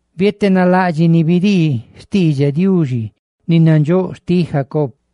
bietenalaꞌdxiꞌ ni bidii xtiidxaꞌ peꞌ, ni nadxóꞌ xti Jacob lii: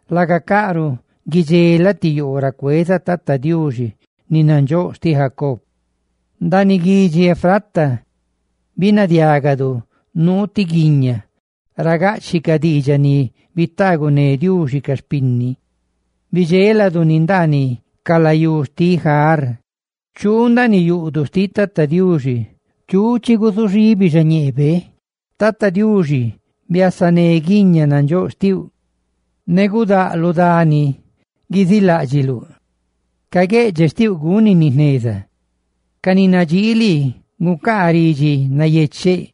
laga caꞌruꞌ guidxelaꞌ ti yoo ra cueza Tata Diuxi, ni nandxóꞌ xtiꞌ Jacob.» Ndaaniꞌ guidxi Efrata binadiagadu nuu ti guiña ra gaꞌchiꞌ ca diidxaꞌ ni bitaaguné Diuxi ca xpinni, bidxéladu ni ndaaniꞌ ca layú xtiꞌ Jáar. ¡Chuu ndaaniꞌ yuꞌduꞌ xtiꞌ Tata Diuxi! ¡Chigusuxibinu xañeebe! Biasa, Tata Diuxi, ne guiña nandxóꞌ xtiuꞌ, ne gudáꞌ lu dani riꞌ ra guiziiláꞌdxiluꞌ. Ca gueꞌdxeꞌ xtiuꞌ guzuchaahuinecaꞌ guendajneza; ne ca ni nadxii lii gucaacaꞌ ridxi nayecheꞌ.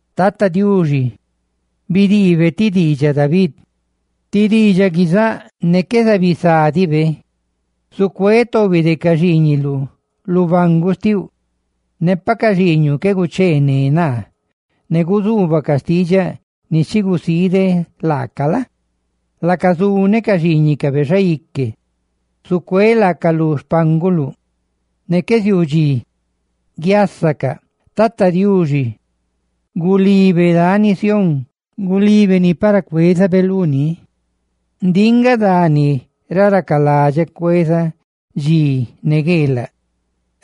Tata Diuxi bidiibe ti diidxaꞌ David, ti diidxaꞌ ni qué zucuí sa laabe: «Zucuéꞌ tobi de ca xiiñiluꞌ lu banguꞌ xtiuꞌ. Pa ca xiiñuꞌ qué gucheené naa ne guzuubacaꞌ diidxaꞌ ni chi gusiideꞌ laacaꞌ la? laaca zuneꞌ ca xiiñicabe xaique, zucuéꞌ laacaꞌ lu xpánguluꞌ ne qué ziuu dxi guiasacaꞌ.» ¡Tata Diuxi gulibe dani Sión! ¡Gulibe ni para cuezabe luni! «Ndiꞌ nga dani ra racaladxeꞌ cuezaꞌ dxi ne gueelaꞌ;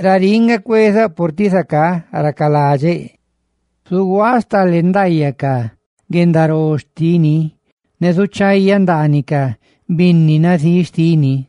raríꞌ nga cuezaꞌ, purtiꞌ zacá racaladxeꞌ. Zuguaaꞌ stale ndaayaꞌ ca guendaró xtini, ne zuchayaꞌ ndaaniꞌ ca binni nazíꞌ xtini.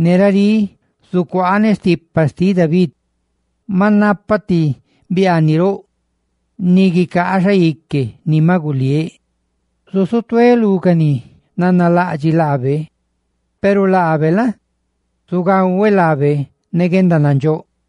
Ne racá gale stipa xtiꞌ David sti bieque. Maꞌ napaꞌ ti biaaniꞌ roꞌ ni guicaa xaique ni maꞌ guliéꞌ. Zusutuéꞌ lú ca ni nanalaꞌdxiꞌ laabe, peru laabe la? zugahueꞌ laabe ne guendanandxóꞌ.»